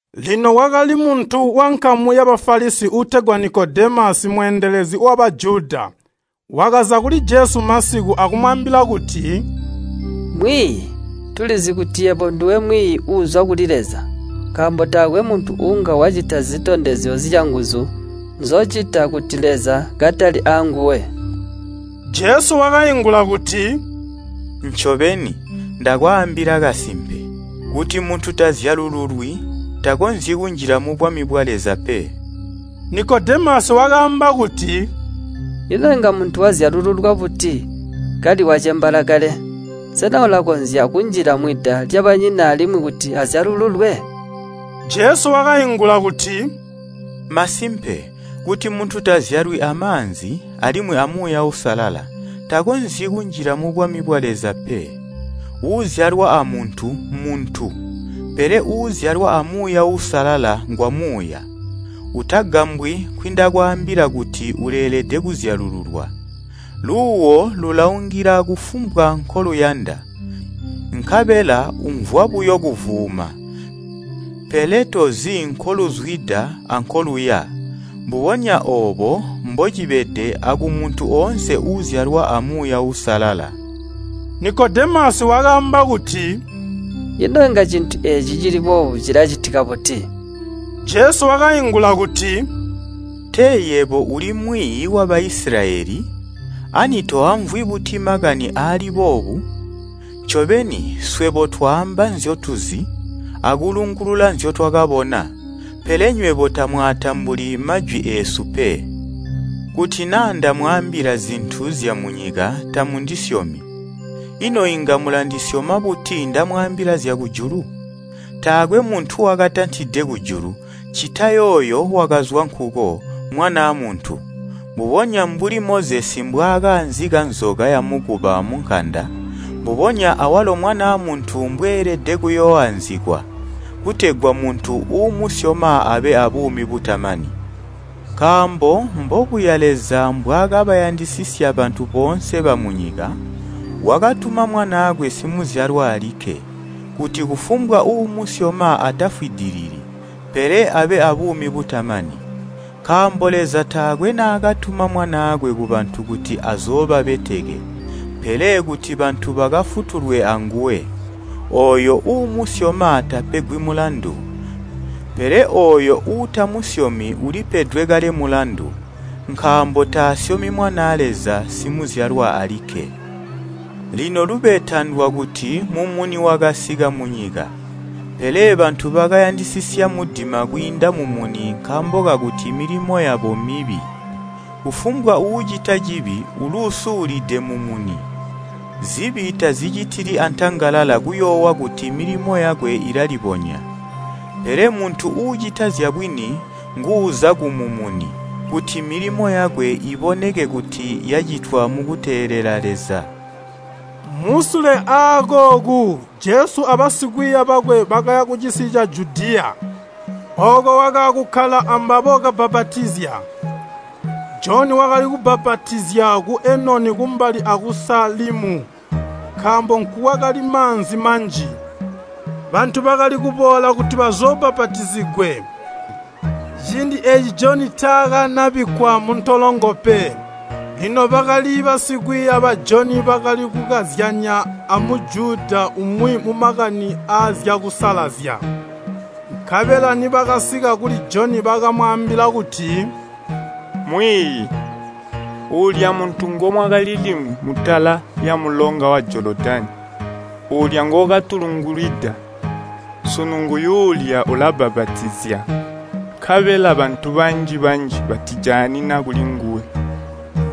Lino kwakali muntu wankamu ya Bafalisi uutegwa Nikodemasi mweendelezi wa Bajuda. Wakaza kuli Jesu masiku, akumwaambila kuti, “Mwiiyi, tulizi kuti yebo nduwe mwiiyi uuzwa kuli Leza, nkaambo taakwe muntu uunga wacita zitondezyo zyanguzu nzocita kuti Leza katali aanguwe.” Jesu wakaingula kuti, “Ncobeni, ndakwaambila kasimpe, kuti muntu tazyalululwi, takonzyi kunjila mubwami bwa Leza pe.” Nikodemasi wakaamba kuti, “Ino inga muntu wazyalululwa buti kali wacembaala kale? Sena ulakonzya kunjila mwida lyabanyina alimwi kuti azyalululwe?” Jesu wakaingula kuti, “Masimpe, kuti muntu tazyalwi amaanzi, alimwi a Muuya Uusalala, takonzyi kunjila mubwami bwa Leza pe. Uuzyalwa amuntu mmuntu, pele uuzyalwa a Muuya Uusalala ngwamuuya. Utagambwi nkwindakwaambila kuti, ‘Uleelede kuzyalululwa.’ Luuwo lulaungila kufumbwa nkoluyanda, nkabela umvwa buyo kuvuuma, pele tozi nkoluzwida ankoluya. Mbubonya oobo mbocibede akumuntu oonse uuzyalwa a Muuya Uusalala.” Nikodemasi wakaamba kuti, “Ino inga cintu eeci cili boobo cilacitika buti?” Jesu wakaingula kuti, “Tee yebo uli mwiiyi wa Baisilayeli, ani toamvwi buti makani aali boobu? Ncobeni, swebo twaamba nzyotuzi, akulungulula nzyotwakabona, pele nywebo tamwaatambuli majwi eesu pe. Kuti naa ndamwaambila zintu zyamunyika tamundisyomi, ino inga mulandisyoma buti ndamwaambila zyakujulu? Taakwe muntu wakatantide kujulu, ccita yooyo wakazwa nkuko, Mwanaa Muntu. Mbubonya mbuli Mozesi mbwaakaanzika nzoka yamukuba munkanda, mbubonya awalo Mwanaa Muntu mbweelede kuyooanzikwa, kutegwa muntu uumusyoma abe abuumi butamani. Nkaambo mbobuya Leza mbwaakabayandisisya bantu boonse bamunyika, wakatuma Mwanaakwe Simuzyalwa alikke, kuti kufumbwa uumusyoma atafwidilili, pele abe abuumi butamani. Nkaambo Leza taakwe naakatuma Mwanaakwe kubantu kuti azoobabeteke, pele kuti bantu bakafutulwe anguwe. Ooyo uumusyoma tapegwi mulandu, pele ooyo uutamusyomi ulipedwe kale mulandu, nkaambo taasyoma Mwanaa Leza, Simuzyalwa alikke. Lino lubeta ndwakuti mumuni wakasika munyika, pele bantu bakayandisisya mudima kwiinda mumuni nkaambo kakuti milimo yabo mibi. Kufumbwa uucita cibi uluusulide mumuni. Zibi tazicitili antangalala kuyoowa kuti milimo yakwe ilalibonya. Pele muntu uucita zyabwini nguuza kumumuni, kuti milimo yakwe iboneke kuti yacitwa mukuteelela Leza.” Musule aakooku Jesu abasikwiiya bakwe bakaya kucisi ca Judiya. Ooko wakaakukkala ambabo kabbapatizya. Joni wakali kubbapatizya ku Enoni kumbali aku Salimu nkaambo nkukwakali maanzi manji. Bantu bakali kuboola kuti bazoobbapatizigwe. Ciindi eeci Joni taakanabikkwa muntolongo pe. Lino bakali basikwiiya ba Joni bakali kukazyanya a Mujuda umwi mumakani aazyakusalazya. Nkabela nibakasika kuli Joni bakamwaambila kuti, “Mwiiyi, uulya muntu ngumwakali limwi mutala lyamulonga wa Jolodani, uulya ngookatulungulwida, sunu nguyuulya ulabbapatizya, nkabela bantu banji-banji batijaanina kulinguwe.”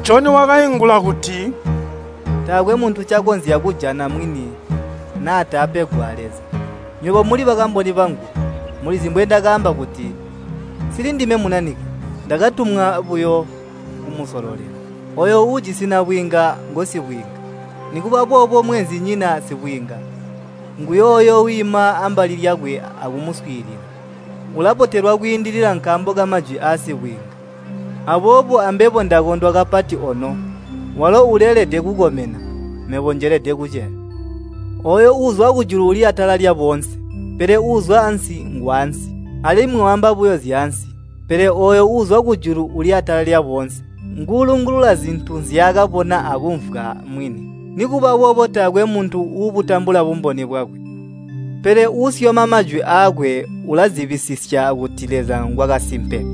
Joni wakaingula kuti, “Taakwe muntu ncakonzya kujana mwini naa taapegwa a Leza. Nywebo muli bakamboni bangu, mulizi mbwendakaamba kuti, ‘Nsilindime Munanike. Ndakatumwa buyo kumusololela.’ Ooyo uujisi nabwiinga, ngosibwiinga. Nikuba boobo mweenzinyina sibwiinga, nguyooyo wiima ambali lyakwe akumuswiilila, ulabotelwa kwiindilila nkaambo kamajwi asibwiinga. Aboobo ambebo ndakondwa kapati ono. Walo uleelede kukomena, mebo njelede kuceya. Ooyo uuzwa kujulu uli atala lyaboonse, pele uuzwa ansi ngwaansi, alimwi waamba buyo zyaansi. Pele ooyo uuzwa kujulu uli atala lyaboonse. Nguulungulula zintu nzyaakabona akumvwa mwini, nikuba boobo taakwe muntu uubutambula bumboni bwakwe. Pele uusyoma majwi aakwe ulazibisisya kuti Leza ngwakasimpe.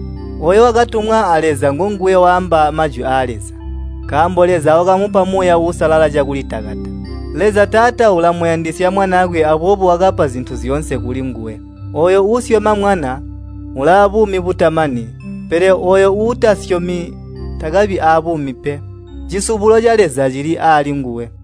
Ooyo wakatumwa a Leza ngonguwe waamba majwi aa Leza, nkaambo Leza wakamupa Muuya Uusalala cakulitakata. Leza Taata ulamuyandisya Mwanaakwe aboobo wakapa zintu zyoonse kulinguwe. Ooyo uusyoma Mwana ulaabuumi butamani, pele ooyo uutamusyomi takabi abuumi pe, cisubulo ca Leza cili aali nguwe.”